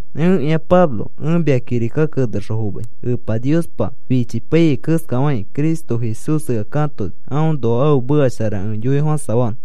Ẽkĩa Pablo ẽ mia kirika kenexõ fomai. Epa Niospa fichipaiyai keskafakĩ Cristo Jesús ea katoni aõnoa ãfe meka shara ẽ yoifofãsafanõ.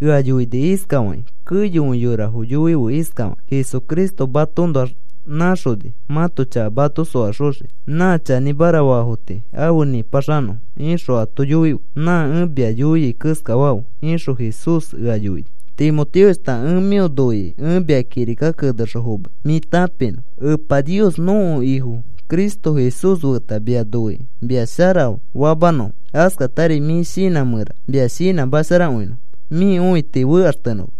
Ea yoini iskafakĩ: “Keyokõi yorafo yoife iskafakĩ: ‘Jesucristo matoõnoax nãxoni mãto chaka mato soaxoxiki nã chanĩmara faafo tii afe nĩpaxanõfo,’ ixõ ato yoife nã ẽ mia yoiai keskafafe,” ixõ Jesús ea yoini. Timoteoshta, ẽ mĩo noikĩ ẽ mia kirika kenexõ fomai mĩ tãpinõ. Epa Nios nõko Ifo Cristo Jesús feta mia noikĩ mia shara famanõfo. Askatari mĩ shinã mẽra mia shinãmasharakõinõfo mĩ õiti fekaxtenõma.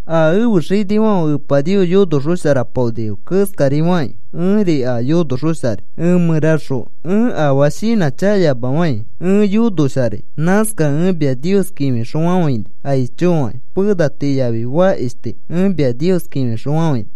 A ẽfe xinifãfe Epa Nios yonoxosharapaonifo keskari fakĩ, ẽri a yonoxosharai. Ẽ mẽraxõ ẽ afaa shinãchakayamafai ẽ yonoxosharai. Nãskakẽ ẽ mia Nios kĩfixõfafãini aicho fakĩ. Pena tii yafi fakish tii ẽ mia Nios kĩfixõfafãini.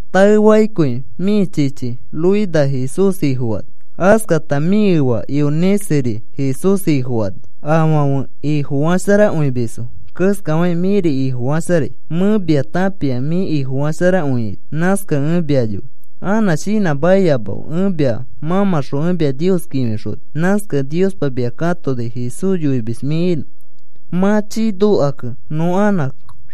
Taefakĩkõi mĩ chichi Loida Jesús Ifofani. Askata mĩ efa Euniceri Jesús Ifofani. Afãfe Ifofasharakõimisfo keskafakĩ, mĩri Ifofasharai. Mẽ mia tãpia mĩ Ifofasharakõiaito nãskakẽ ẽ mia yoi. Anã shinãmakiyamafe ẽ mia mãmãxõ ẽ mia Nios kĩfixoni. Nãskakẽ Niospa mia katoni Jesús yoimis mĩ inõ. Mã chii nokakẽ nõ anã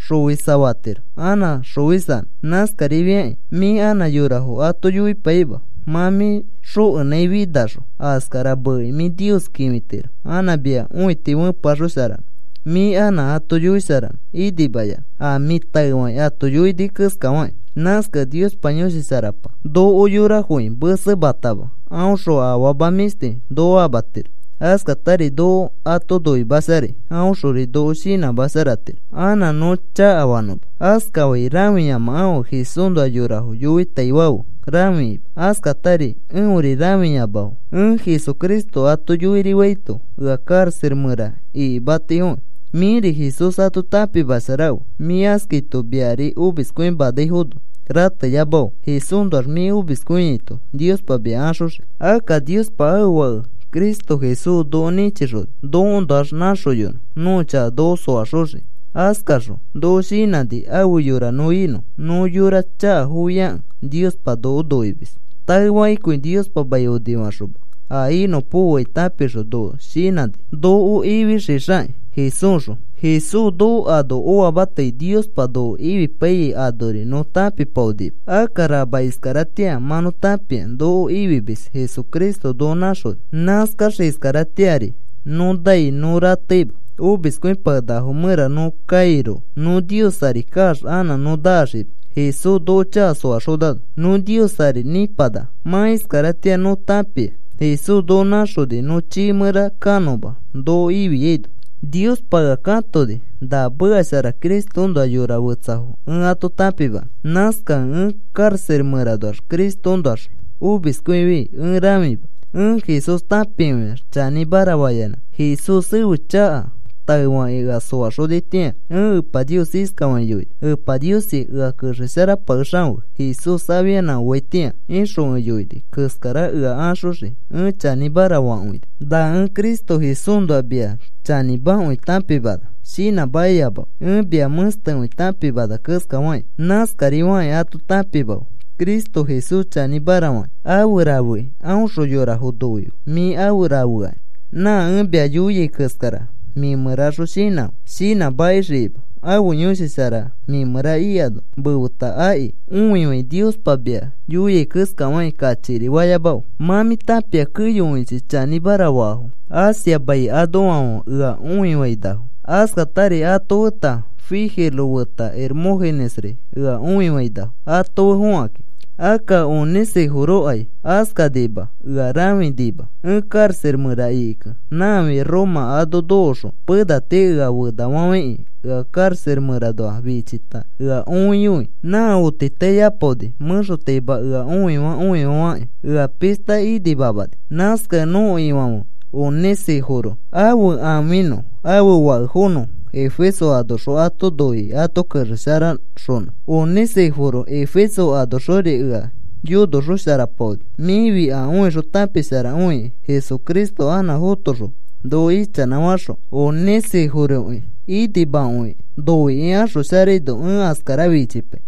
xofisa fatiro anã xofisanõ. Nãskarifiakĩ mĩ anã yorafo ato yoipaima mã mĩ xokenãifinaxõ askara meekĩ mĩ Nios kĩfitiro anã mia õiti fepeaxosharanõ, mĩ anã ato yoisharanõ inimayanã a mĩ taefakĩ ato yoini keskafakĩ. Nãskakẽ Niospa Yõshi Sharapa noko yorafoki mesematama. Aõxõ afama mĩshti noko amatiro. Askatari noko ato noimasharai. Aõxori noko shinãmasharatiro anã nõ chakafanõma. Askafai rãfiyamafe Jesúsnoa yorafo yoitaifãfe rãfikima. Askatari eõri rãfiyamafe. Ẽ Jesucristo ato yoirifaito ea karaxa mẽra ikimatifoki. Mĩri Jesús ato tãpimasharafe; mĩ askaito, miari omiskõimanaifono rateyamafe. Jesúsnoax mĩ omiskõiaito, Niospa mia axoxii. Akka Niospa ãfe Fake Cristo Jesús noko nĩchixoni nokoõnoax nãxoyonõ nõko chaka noko soaxoxiki. Askaxõ noko shinãni afe yora nõ inõ. Nõ yora chakafofiakẽ Niospa noko noimis. Taefakĩkõi Niospa mai onifaxoma, a inõpokoai tãpixõ, noko shinãni noko ifixixakĩ Jesúsxõ. Jesús noko ano oamatai Niospa noko ifipaiyai anori nõ tãpipaonima. Akka rama iskaratĩa mã nõ tãpia noko ifimis Jesucristo noko nãxoni. Nãskax iskaratĩari nõ nai, nõ rateima omiskõipakenakafo mẽra nõ kairoko. Nõ Nios ari kaax anã nõ naxima. Jesús noko chaka soaxonano nõ Nios ari nĩpanaka. Mã iskaratĩa nõ tãpia Jesús noko nãxoni nõ chiifã mẽra kanõma noko ifiano. Niospa ea katoni na meka shara Cristoõnoa yora fetsafo ẽ ato tãpimanõ. Nãskakẽ ẽ karaxa mẽranoax Cristoõnoax omiskõifi ẽ rãfima. Ẽ Jesús tãpikõiax chanĩmara fayanã. Jesús ẽfe chaka taefakĩ ea soaxonitĩa ẽ Epa Nios iskafakĩ yoini: “Epa Niosi, ea kexesharapakexafe Jesús afianã oaitĩa,” ixõ ẽ yoini keskara ea axoxii ẽ chanĩmara fakõini. Na ẽ Cristo Jesúsnoa mia chanĩmakõi tãpimana shinãmakiyamafe. Ẽ mia mẽstekõi tãpimana keskafakĩ, nãskari fakĩ ato tãpimafe. Cristo Jesús chanĩmara fakĩ afe rafekĩ aõxõ yorafo noife mĩ afe rafeakĩ. Nã ẽ mia yoia keskara mĩ mẽraxõ shinãfe, shinãmakixikima. Ãfe Yõshi Shara mĩ mẽra ikano mefeta aki. Õifãi, Niospa mia yoia keskafakĩ kachikiri fayamafe. Mã mĩ tãpia keyokõichi chanĩmara faafo Asia mai anoafãfe ea õifainafo. Askatari ato feta Figelo feta Hermógenesri ea õifainafo ato fe fokãkĩ. Akka Onesíforokai askanima, eõ rãfinima ẽ karaxa mẽra ikikẽ. Nãafi Roma ano nokoxõ pena tii ea fenafafãikĩ ea karaxa mẽranoa fichita, ea õiyoi nã otitaiapaoni mẽxotaima ea õifaa õifakĩ, ea pishta inimamani. Nãskakẽ nõko Ifãfe Onesíforo ãfe ãfinõ ãfe fakefonõ Efeso anoxõ ato noikĩ ato kexesharaxonõ. Onesíforo Efeso anoxori ea yonosharaxopaoni, mĩfi a õixõ tãpisharakĩ. Jesucristo anã fotoxõ noko ichanãfaxõ Onesíforoki inimakõikĩ noikĩ axosharaino ẽ askara fichipai.